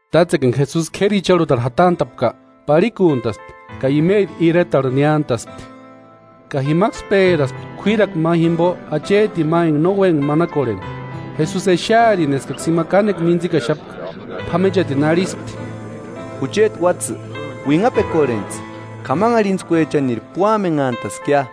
Tátsekua enka Jesusi k'éri icharhutarhu jatant'a'pka, parhikuntaspti ka imeri iretarhu niántaspti. Ka jimaksï pérakuspti k'uírakua ma jimpo achetini ma enka no úempka manakorheni. Jesusi exearini eskaksï ima kánekua mintsikaxapka, p'amenchatini arhispti: –Jucheti uátsï, uinhapekorhentsï, k'amanharhintskuechaniri púamenhantaskia.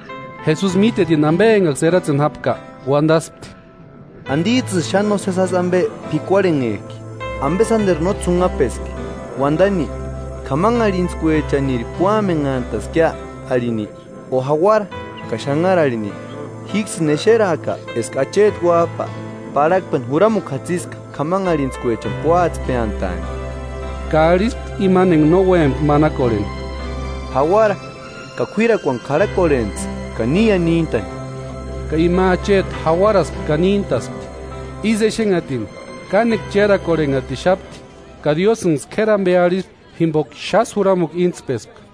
Jesusi mítetini ampe enkaksï eratseni jápka, uantaspti: –¿Antits'ïsï xáni nósesi jásï ampe p'ikuarhenhek'i? ¿Ampe sánteru no ts'unhapeski, uantani: “K'amanharhintskuechaniri púamenhantaskia arhini, o jauara ka xanhara arhini?” Jíksïni exeraaka eska Acheti Uáp'a, parhakpeni juramukua jatsiska k'amanharhintskuechani púatspeantaani. Ka arhispti imani enka no úempka manakorheni: –Jauara ka k'uírakuani k'arhakorhentsï ka níia níntani. Ka ima acheti jauaraspti ka níntaspti. Ísï exenhatini, kánekua chérakorhenhatixapti ka Diósïnksï k'éri ampe arhispti jimpoka xásï juramukua íntspespka.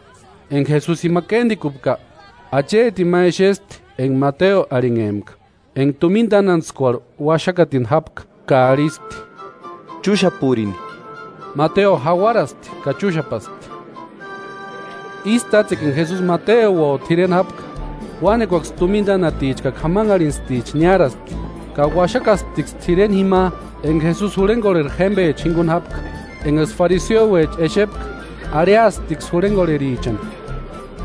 Enka Jesusi jima kéntikupka, achetini ma exespti enka Mateo arhinhempka, enka tumina tánantskuarhu uaxakatini jápka ka arhispti: –Chúxapurini. Mateo jauaraspti ka chúxapaspti. Ísï tátsekua, enka Jesusi Mateuo t'ireni jápka, uánekuaksï tumina tánaticha ka k'amanharhintsticha niáraspti, ka uaxakasptiksï t'ireni jima enka Jesusi jurhenkorheri jémpecha jinkuni jápka. Enkaksï fariseuecha exepka arhiasptiksï jurhenkorherichani: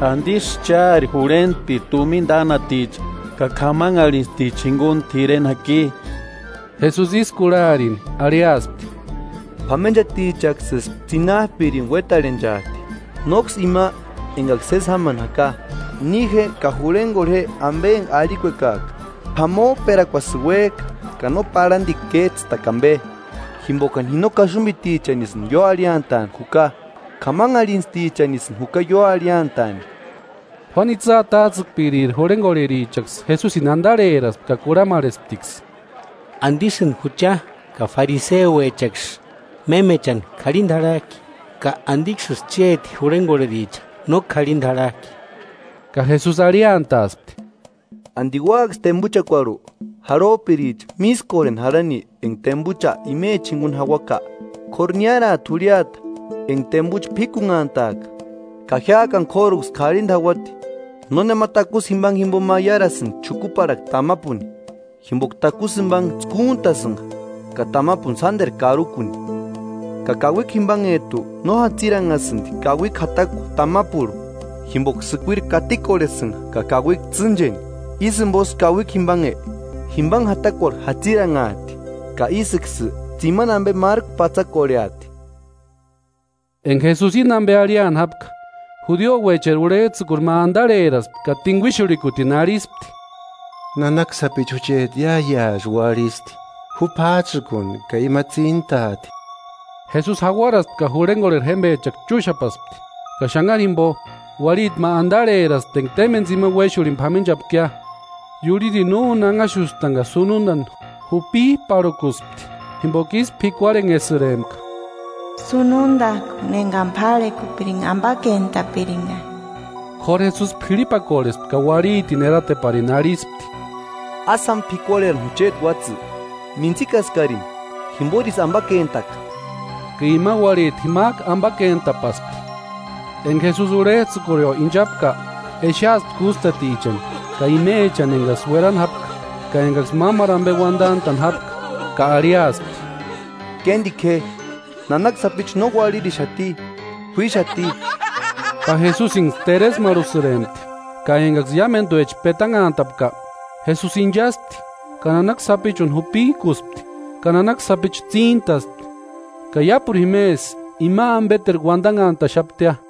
–¿Antisï chári jurhentpiri tumina tánaticha ka k'amanharhintstichani jinkuni t'ireni jaki? Jesusi ísï kurharini arhiaspti: –P'amenchatichaksïsï tsinap'irini uétarhenchat'i, nóksï ima enkaksï sési jámani jaka. Ni je ka jurhenkorhe je ampe enka arhikuekak'a “P'amop'erakuasïni uék'a ka no parhantikua kéts'ïtakua ampe.” Jimpokani ji no kaxumpitichanisï ióarhiantaani juka, k'amanharhintstichanisïni juka ióarhiataani. Juánu itsï atats'ïkpiriri jurhenkorherichaksï, Jesusini antarheraspti ka kurhamarhesptiksï: –¿Antisïni jucha ka fariseuechaksï mémechani k'arhinta jarhak'i? ¿Ka antiksïsï chéti jurhenkorhericha no k'arhinta jarhak'i? Ka Jesusi arhiantaaspti: –¿Anti úaksï tempuchakuarhu, jarhop'iricha mískorheni jarhani enka tempucha imechani jinkuni jauaka? K'óru niáraati jurhiata enka tempucha p'íkunhantaaka ka jiák'ani k'óruksï karhinta jauati. “Nónema takusï jimpanhe jimpo maiarasïnti xukuparhakua tamapuni, jimpoka takusï jimpanhe tskúntasïnka ka tamapuni sánteru karukuni. Ka kauikua jimpanhet'u no jatsiranhasïnti kauikua jatakua tamapurhu, jimpoka sïkuiri katikorhesïnka ka kauikua tsîncheni. Ísï jimposï kauikua jimpanhe, jimpanhe jatakuarhu jatsiranhat'i, ka ísïksï tsimani ampe márku patsakorheati.” Enka Jesusi íni ampe arhiani jápka, judiuecheri urhets'ïkuri ma antarheraspti, ka tinkuixurhikutini arhispti: –Nanaka sapichu jucheti iáiasï uarhisti; ju p'áts'ïkuni ka ima tsíntaati. Jesusi jauaraspti ka jurhenkorheri jémpechaksï chúxapaspti. Ka xanhari jimpo, uarhiti ma antarheraspti enka témpeni tsimani uéxurhini p'amenchapkia, iurhirini no úni anhaxustani ka sununtani jupip'arhukuspti, jimpoka ísï p'ikuarhenhesïrempka: “Sunudak'uni ekani párhekupirinka, ampakentaaka.” K'óru Jesusi p'irhipakorhespti ka uarhitini erateparini arhispti: –Ásï jáma p'ikuarherani jucheti uátsï, mintsikaskarini jimporisï ampakentaka. Ka ima uarhiti jimak'u ampakentapaspti. Enka Jesusi urhets'ïkurio inchapka, exeaspti kústatichani, ka imechani enkaksï uerani jápka, ka enkaksï mámaru ampe uantant'a'ni jápka, ka arhiaspti: –Kéntiku je, nanaka sapichu no uarhirixati, k'uíxati. Ka Jesusinksï teresmarhusïrempti. Ka enkaksï iámentuecha petanhantapka, Jesusi inchaspti ka nanaka sapichuni jupik'uspti, ka nanaka sapichu tsíntaspti. Ka iápuru jimesï ima ampeterku uantanhantaxaptia.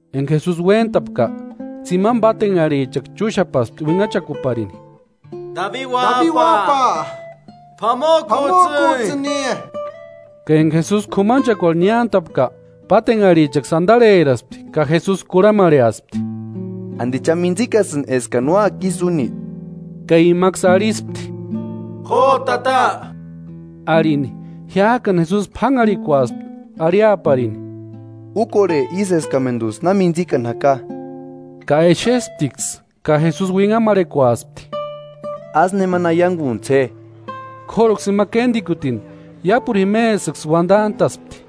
Enka Jesusi uéntapka, tsimani pátenharhichaksï chúxapaspti uinhachakuparini: –¡Dabi uáp'a, p'amok'uts'ïni! Ka enka Jesusi k'umanchekuarhu niántapka, pátenharhichaksï antarheraspti ka Jesusi kurhamarheaspti: –¿Anti cha mitsikasïnki eskani úaka ísï úni? Ka imaksï arhispti: –¡Jo, Tata! Arhini. Jiák'ani Jesusi p'ánharhikuaspti arhiaparini: –Úkorhe ísï eskamentuts'ï na mintsikani jaka. Ka exesptiksï ka Jesusi uinhamarhekuaspti: –Ásï nemani aiankuntsï je. K'óruksï ima kéntikutini iápuru jimesïksï uantant'a'spti.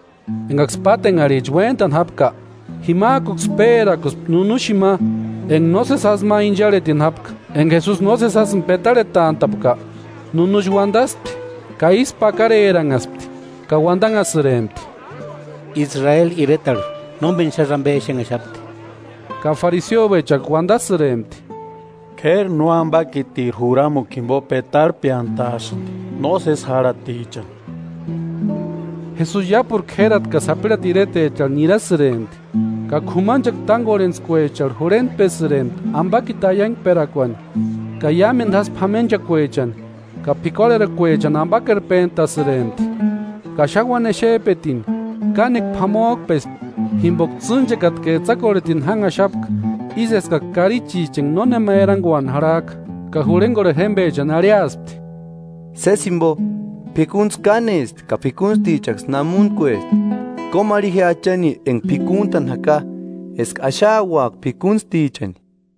Enkaksï pátenharhicha uéntani jápka, jimak'uksï pérakuspti nunuxini ma enka nósesi jásï ma incharhetini jápka. Enka Jesusi nósesi jásïni petarhetant'a'pka, nunuxi uantaspti. Ka ísku pakareranhaspti ka uantanhasïrempti: –Israeli iretarhu nómeni xásï ampe exenhaxapti. Ka fariseuechaksï uantasïrempti: –K'éri nóampakitiri juramukua jimpo petarhpeantaasïnti nósesi járhatichani. Jesusi iápuru k'érati ka sapirhati iretecharhu nirasïrempti, ka k'umanchekua tánkorhentskuecharhu jurhentpesïrempti ampakiti aiankperakuani, ka iámentu jásï p'amenchakuechani ka p'ikuarherakuechani ampakerpentasïrempti. Ka xáni uáni exep'etini, kánekua p'amok'pespti jimpoka tsînchekata ka etsakorhetini jánhaxapka, ísï eskaksï karichicha enka nónema erankuani jarhak'a. Ka jurhenkorheri jémpechani arhiaspti: –Sési jimpo, p'ikuntskua kánesti ka p'ikuntstichaksï namuntkuesti. Kómarhi je Achani enka p'ikuntani jaka eska axauaka p'ikuntstichani.